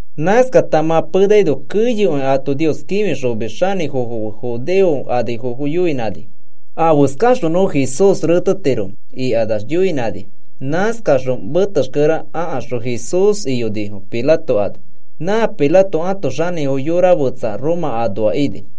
Nãskata mã penaino keyokõi a ato Nios kĩfixomis xanĩfofo fe judeo anifofo yoinãnifo: “¿Afeskaxõ nõ Jesús retetiromẽ?” ikanax yoinãnifo. Nãskakaxõ metexkere akaxõ Jesús iyonifo Pilato ano. Nã Pilato ãto xanĩfo yora fetsa Roma anoa ini.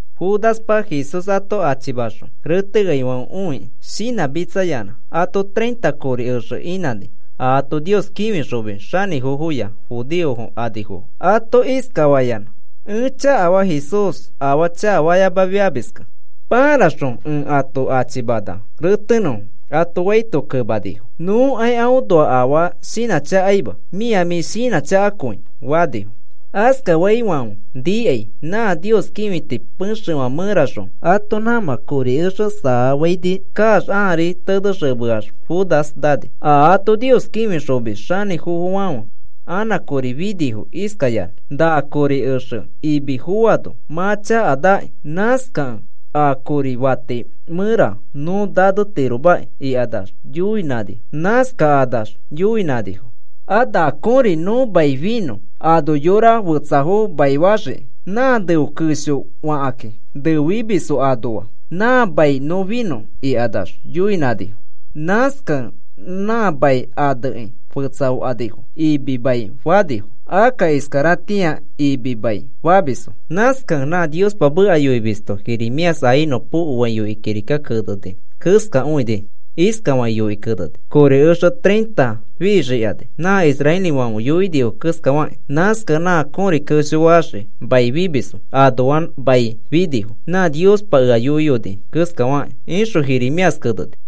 Judaspa Jesús ato achimaxõ reteaifãfe õikĩ shinãmitsayanã ato treinta kori exe inãni, a ato Nios kĩfixomis xanĩfofoya judeo anifofo. Ato iskafayanã: “Ẽ chakafaa, Jesús afaa chakafayamafiamiskẽ. Paraxõ ẽ ato achimana retenõfo,” ato faito kemanifo: “Nõkai aõnoa afaa shinãchakaima. Mĩa mĩ shinãchakakõi,” fanifo. Askafaifãfe nikai nã Nios kĩfiti pexefã mẽraxõ ato nãmã kori exe saafaini kaax ãari tenexemeax Judas nani. A ato Nios kĩfixomis xanĩfofofãfe anã kori finifo iskayanã: “Na kori exe imi foano mã chakanaki. Nãskakẽ a kori fati mẽra nõ nanetiromaki,” ikax yoinãnifo. Nãskakanax yoinãnifo: “A na kõri nõ mai finõ ano yora fetsafo maifaxiki. Nã neo kesho fakakĩ neo fimisfo anoa nã mai nõ finõ,” ikanax yoinãnifo. Nãskakẽ nã mai anekĩ fetsafanifo. “Imi Mai,” fanifo. Akka iskaratĩari, “Imi Mai,” famisfo. Nãskakẽ nã Niospa meka yoimisto Jeremías a inõpokoai yoikĩ kirika keneni keskakõini. Iskafakĩ yoikĩ keneni: Kori exe treinta fixikani nã israelifãfe yoinifo keskafakĩ. Nãskakẽ nã kõri kesho faxii mai fimisfo anoa nã mai finifo nã Niospa ea yoiyoni keskafakĩ, ixõ Jeremías keneni.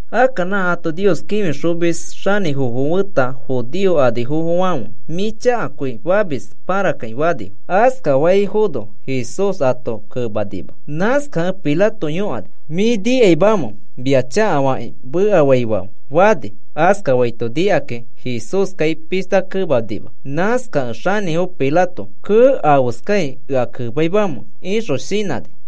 Akka nã ato Nios kĩfixomis xanĩfofo feta judeo anifofofãfe, “Mĩ chakakõi famis,” pãrakĩ fanifo. Askafaifono Jesús ato kemanima. Nãskakẽ Pilato yõkani: “¿Mĩ nikaimamẽ mia chakafakĩ mekafaifãfe?” fani. Askafaito nikakĩ, Jesúskai pishta kemanima. Nãskakẽ xanĩfo Pilato, “Kee, ¿afeskai ea kemaimamẽ?” ixõ shinãni.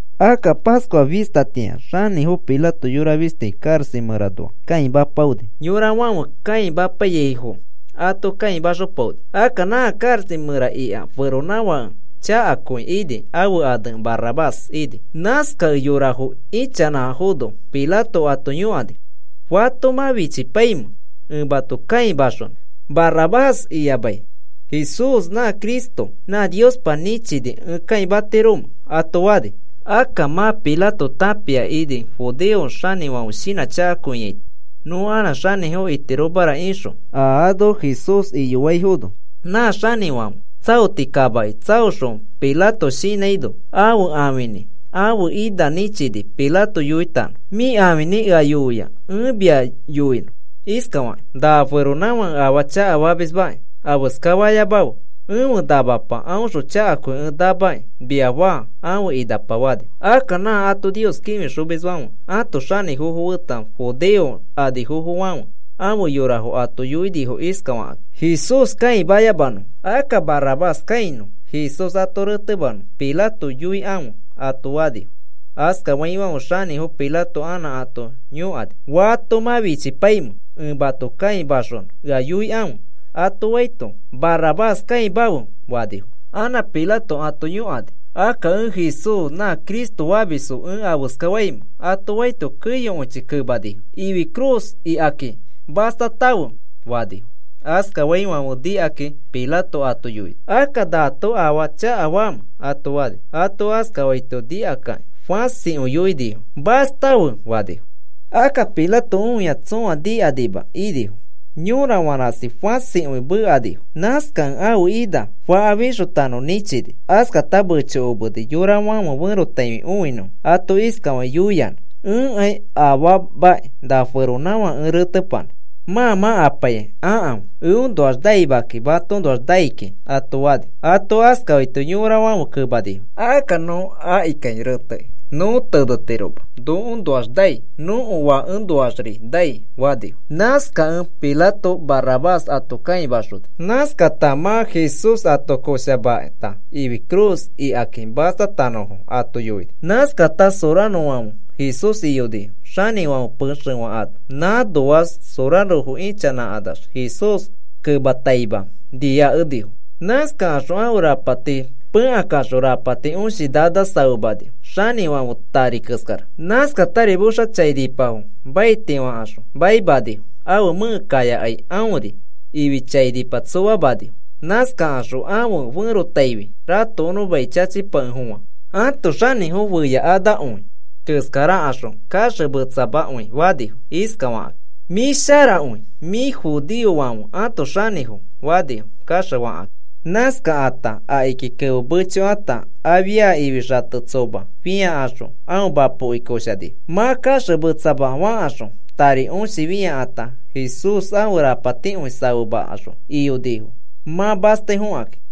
Akka Pascua fistatĩa xanĩfo Pilato yora fisti karaxa mẽranoa kãimapaoni. Nã yorafãfe kãimapaiyaifo ato kãimaxopaoni. Akka nã karaxa mẽra ika feronãfake chakakõi ini, ãfe ane Barrabás ini. Nãskakẽ yorafo ichanãfono Pilato ato yõkani: “¿Fato mã fichipaimẽ ẽ mato kãimaxonõ? ¿Barrabás iyamai Jesús nã Cristo nã Niospa nĩchini ẽ kãimatiromẽ?” ato fani. Akka mã Pilato tãpia ini judeo xanĩfãfe shinãchakaito nõ anã xanĩfo itiromara ixõ, a ano Jesús iyoaifono. Nã xanĩfãfe tsaoti kamaki tsaoxõ Pilato shinãino, ãfe ãfinĩ ãfe ina nĩchini Pilato yoitanõ: “Mĩ ãfinĩ ea yoia ẽ mia yoinõ iskafakĩ: ‘Na feronãfãke afaa chakafamismakĩ afeska fayamafe. Ẽfe namapa aõxõ chakakõi ẽ namakĩ,’ mia faa,” ãfe inapa fani. Akka nã ato Nios kĩfixomisfãfe ãto xanĩfofo feta judeo anifofofãfe ãfe yorafo ato yoinifo iskafakakĩ: “Jesús kãiyamanõ. Akka Barrabás kãinõ. Jesús ato retemanõ Pilato yoikãfe,” ato fanifo. Askaifãfe xanĩfo Pilato anã ato yõkani: “Fato mã fichipaimẽ ẽ mato kãimaxonõ ea yoikãfe,” ato faito, “Barrabás kãimafe,” fanifo. Anã Pilato ato yõkani: “Akka, ¿ẽ Jesús nã Cristo famisfo ẽ afeska faimẽ?” ato faito, keyokõichi kemanifo: “¡Ifi cruz ikaki mastamafe!” fanifo. Askafaifãfe nikakĩ Pilato ato yoini: “Akka, ¿naato afaa chakafamẽ?” ato fani. Ato askafaito nikakakĩ fãsikõi yoinifo: “¡Mastafe!” fanifo. Akka Pilato õia tsõa nikakanima inifo. Yorafã rasi fãsikõi mekanifo. Nãskakẽ ãfe ina faka fixotanõ nĩchini. Askata mechokomeni yorafãfe ferotaifi õinõfo ato iskafakĩ yoiyanã: “Ẽkai afaamaki na feronãfake ẽ retepanã. Mã mã apaikai akãfe. Eõnoax naima kiki. Matoõnoax nai kiki,” ato fani. Ato askafaito yorafãfe kemanifo: “Akka nõ akikai retekĩ nõ tenetiroma nokoõnoax nai. Nõko fakefoõnoaxri nai,” fanifo. Nãskakẽ Pilato Barrabás ato kãimaxoni. Nãskata mã Jesús ato koshamata ifi cruz ikaki mastatanõfo ato yoini. Askata sorarofãfe Jesús iyonifo xanĩfãfe pexefã ano. Nãnoax sorarofo ichanãkanax Jesús kemataima niakenifo. Nãskakaxõ ãfe rapati pẽkakaxõ, rapati õshi nana safemanifo, xanĩfãfe tari keskara. Nãskatari moxa chainipafo maiti fãkaxõ maimanifo. Ãfe mẽke kaiyakai aõriri ifi chati tsomamanifo. Nãskakaxõ ãfe ferotaifi ratokonõ mai chachipakefofã ãto xanĩfo feyakanakõi keskarakaxõ kaxemetsamakõi fanifo, iskafakĩ: “Mĩ sharakõi. Mĩfi judeofãfe ãto xanĩfo,” fanifo kaxefakakĩ. Nãskakata akiki kemo mechokata, afia ifi xate tsoma fĩakaxõ aõ mapoki koshanifo. Mã kaxemetsama fakaxõ, tari õshi fĩakata, Jesús ãfe rapatikõi safemakaxõ iyonifo mã mastai fokakĩ.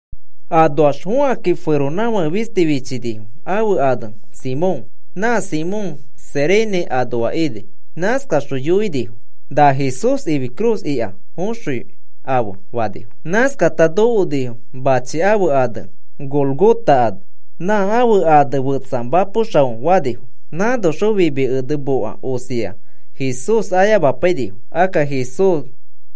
Anoax fõkakĩ, feronãfake fisti fichinifo ãfe ane Simón. Nã Simón Cirene anoa ini. Nãskaxõ yoinifo: “Na Jesús ifi cruz ika foxõi afe,” fanifo. Nãskakata nokonifo machi ãfe ane Gólgota ano. (Nã ãfe ane fetsa Mapo Xao fanifo.) Nãnoxõ fimi ene moka osia Jesús ayamapainifo. Akka Jesús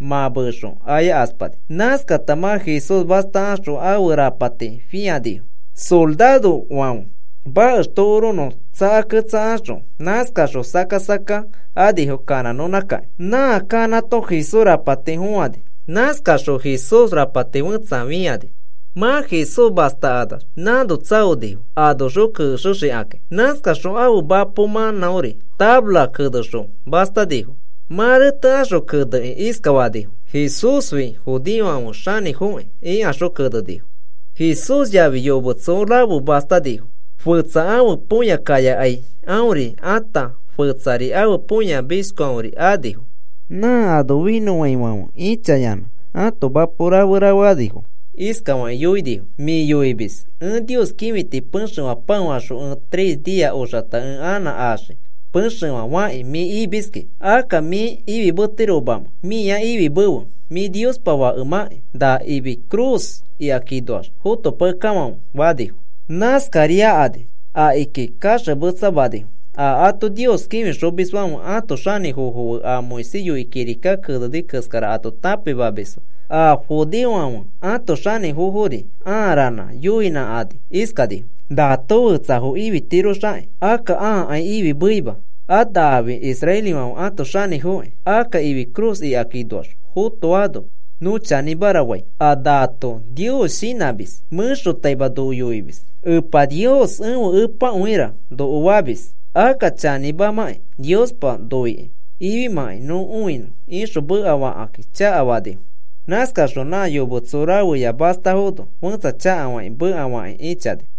mã meexõ ayakaspani. Nãskata mã Jesús mastakaxõ ãfe rapati fĩanifo. Sorarofãfe makex tokoronõ tsakaketsakaxõ nãskakaxõ sakka sakka anifo kanãnõnãkakĩ. Nã kanãto Jesús tari fõani. Nãskaxõ Jesús rapati fetsa fĩanifo. Mã Jesús mastakanax nãno tsaonifo anoxõ kexexikakĩ. Nãskaxõ ãfe mapo mãnãori tafaraki kenexõ mastanifo. Mã retekaxõ kenekĩ iskafanifo: “Jesúsfi judeofãfe xanĩfoki,” ikaxõ kenenifo. Jesús yafi yometso rafe mastanifo, fetsa ãfe põya kayakai aõri ata, fetsari ãfe põya mishkiori anifo. Nã ano finõfãifãfe ĩchayanã ãto mapo rafe rafeanifo. Iskafakĩ yoinifo: “Mĩ yoimis ẽ Nios kĩfiti pexefã pãofaxõ ẽ tres nia oxata ẽ anã axii pexefã fakĩ mĩ imiski, akka mĩ ifimetiromãkĩ mĩa ifimefe. Mĩ Niospa Fakemãkĩ na ifi cruz ikakinoax fotopakekafãfe,” fanifo. Nãskariakani akiki kaxemetsamanifo a ato Nios kĩfixomisfãfe ãto xanĩfofo fe a Moisés yoikĩ kirika keneni keskara ato tãpimamisfo a judeofãfe ãto xanĩfofori ãa ranã yoinãnãkani iskanifo: “Naato fetsafo ififitiroxakĩ, akka ãakai ifimeima. A nafi israelifãfe ato xanĩfokĩ, akka ifi cruz ikakinoax fotoano nõ chanĩmara fai. A naato Nios shinãmis. Mẽxotaima noko yoimis: ‘Epa Nios ẽfe Epakõira,’ noko famis. Akka chanĩmamakĩ Niospa noikĩ ifimãkai nõ õinõ,” ixõ mekafakĩ chakafanifo. Nãskaxõ nã yometso rafeya mastafono fẽtsa chakafakĩ mekafakĩ ĩchani.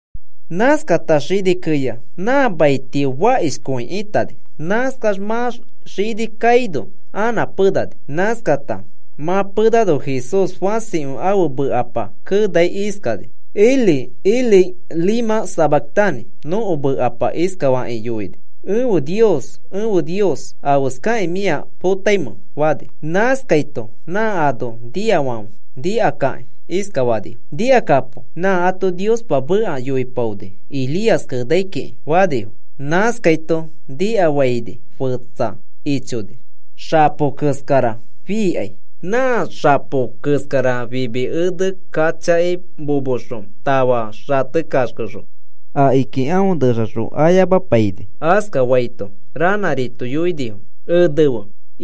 Nãskata xini keya nã mai tio fakishifãkõi itani. Nãskax mã xini kaino anã penani. Nãskata mã penano Jesús fãsikõi ãfe mekapa kenai iskani: “Elí, Elí, ¿lema sabactani?” Nõko mekapa iskafakĩ yoini: “Ẽfe Nios, Ẽfe Nios, ¿afeskakĩ mĩa ea potamẽ?” fani. Nãskaito nã ano niafãfe nikakakĩ iskafanifo: “Nikakapo, nã ato Niospa meka yoipaoni Elías kenai kiki,” fanifo. Nãskaito nikafaini fetsa ichoni xapo keskara fiikai. Nã xapo keskara fimi ene kachaki momoxõ tafa xate kaxkexõ akiki aõ nẽtaxõ ayamapaini. Askafaito ranãrito yoinifo: “Enefe.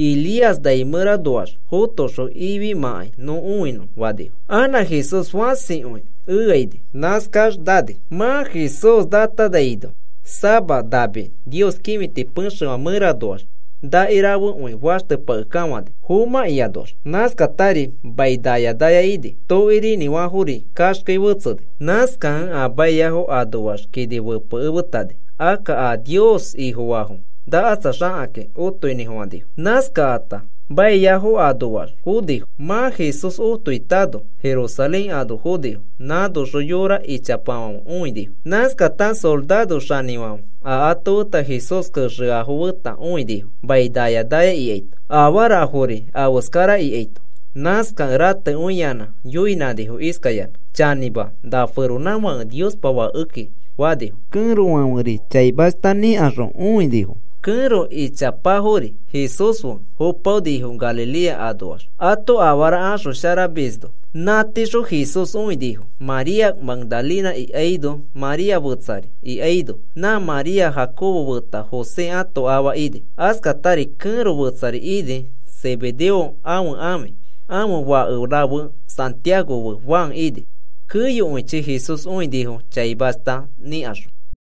Elías nai mẽranoax fotoxõ ifimãkai nõ õinõ,” fanifo. Anã Jesús fãsikõi ea ini. Nãskax nani. Mã Jesús natanaino, sama nami Nios kĩfiti pexefã mẽranoax naki rafekõi faxtepakekafãni fomãkĩanoax. Nãskatari mai naya naya ini. Tokirinĩfãfori kaxkei fetseni. Nãskakẽ a maiafo anoax kini fepekemetani. Akka a Nios Ifofaafo nakatsaxakakĩ otoinĩfofãnifo. Nãskakata maiafo anoax fonifo. Mã Jesús otoitano, Jerusalén ano fonifo. Nãnoxõ yora ichapafãfe õinifo. Nãskata soraro xanĩfãfe a afeta Jesús kexeafo feta õinifo mai naya naya ikaito afarafori afeskara ikaito. Nãskakẽ ratekõiyanã yoinãnifo iskayanã: “Chanĩma, na feronãfake Niospa Fake ika,” fanifo. Kẽrofãferi chaimashta nikaxõ õinifo. Kẽro ichapafãferi Jesús fe fopaonifo Galilea anoax ato afara axosharamisno. Nã tiixõ Jesús õinifo. María Magdalena ikaino María fetsari ikaino, nã María Jacobo feta José ãto afa ini. Askatari kẽro fetsari ini Zebedeo ãfe ãfi. Ãfe fake rafe Santiago fe Juan ini. Keyokõichi Jesús õinifo chaimashta nikaxõ.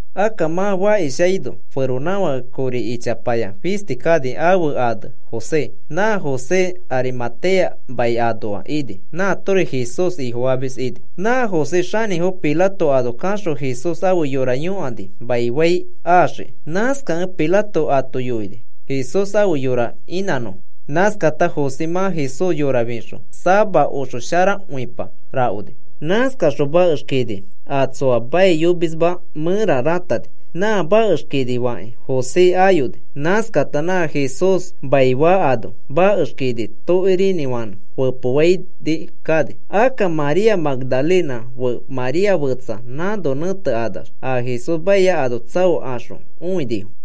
Akka mã fakishaino feronãfake kori ichapaya fisti kani ãfe ane José. Nã José Arimatea mai anoa ini. Nãatori Jesús Ifofamis ini. Nã José xanĩfo Pilato ano kaxõ Jesús ãfe yora yõkani maifai axiki. Nãskakẽ Pilato ato yoini Jesús ãfe yora inãnõfo. Nãskata José mã Jesús yora fixõ, sama oxosharakõipa rakoni. Nãskaxõ makex kini a tsoa maiyomisma mẽra ratani. Nã makex kini fakĩ José ayoni. Nãskata nã Jesús maifaa ano makex kini tokirinĩfanẽ fepofaini kani. Akka María Magdalena fe María fetsa nãno nẽtekanax a Jesús maia ano tsaokaxõ õinifo.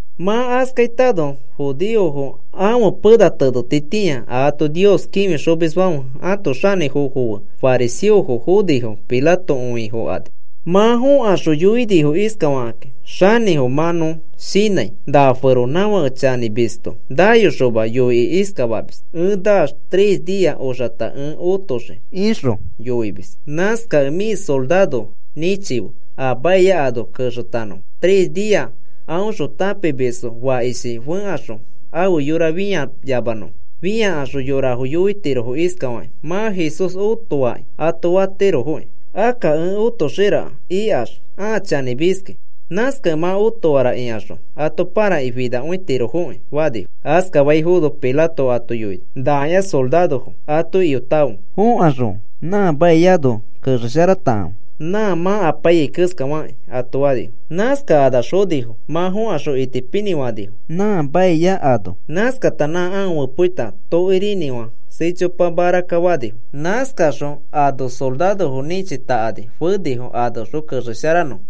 Mã askaitano, judeofo ãfe pena tenetitĩa a ato Nios kĩfixomisfãfe ãto xanĩfofo fe fariseofo fonifo Pilato õifokani. Mã fõkaxõ yoinifo iskafakakĩ: “Xanĩfo, mã nõ shinãi na feronãfake chanĩmisto nayoxoma yoikĩ iskafamis: ‘Ẽ naax tres nia oxata ẽ otoxii,’ ixõ yoimis. Nãskakẽ mĩ sorarofo nĩchife a maia ano kexeyonõfo tres nia aõxõ tãpimisfo fakishi fẽkaxõ ãfe yora fiyamanõfo. Fĩakaxõ yorafo yoitirofo iskafakĩ: ‘Mã Jesús otoaki,’ ato fatirofoki. Akka ẽ otoxira ikax a chanĩmiskĩ. Nãskakẽ mã otoara ikaxõ ato parakĩ finakõitirofoki,” fanifo. Askafaifono Pilato ato yoini: “Nakĩa sorarofo. Ato iyotakãfe. Fokaxõ mafa kini kexesharatakãfe nã mã apaiyai keskafakĩ,” ato fani. Nãskakanax fonifo. Mã fõkaxõ itipinĩ fanifo nã mafa kini. Nãskata nã aõ fepoa tokirinĩfã sichopa marakka fanifo. Nãskakaxõ ano sorarofo nĩchitakani fenifo anoxõ kexesharanõfo.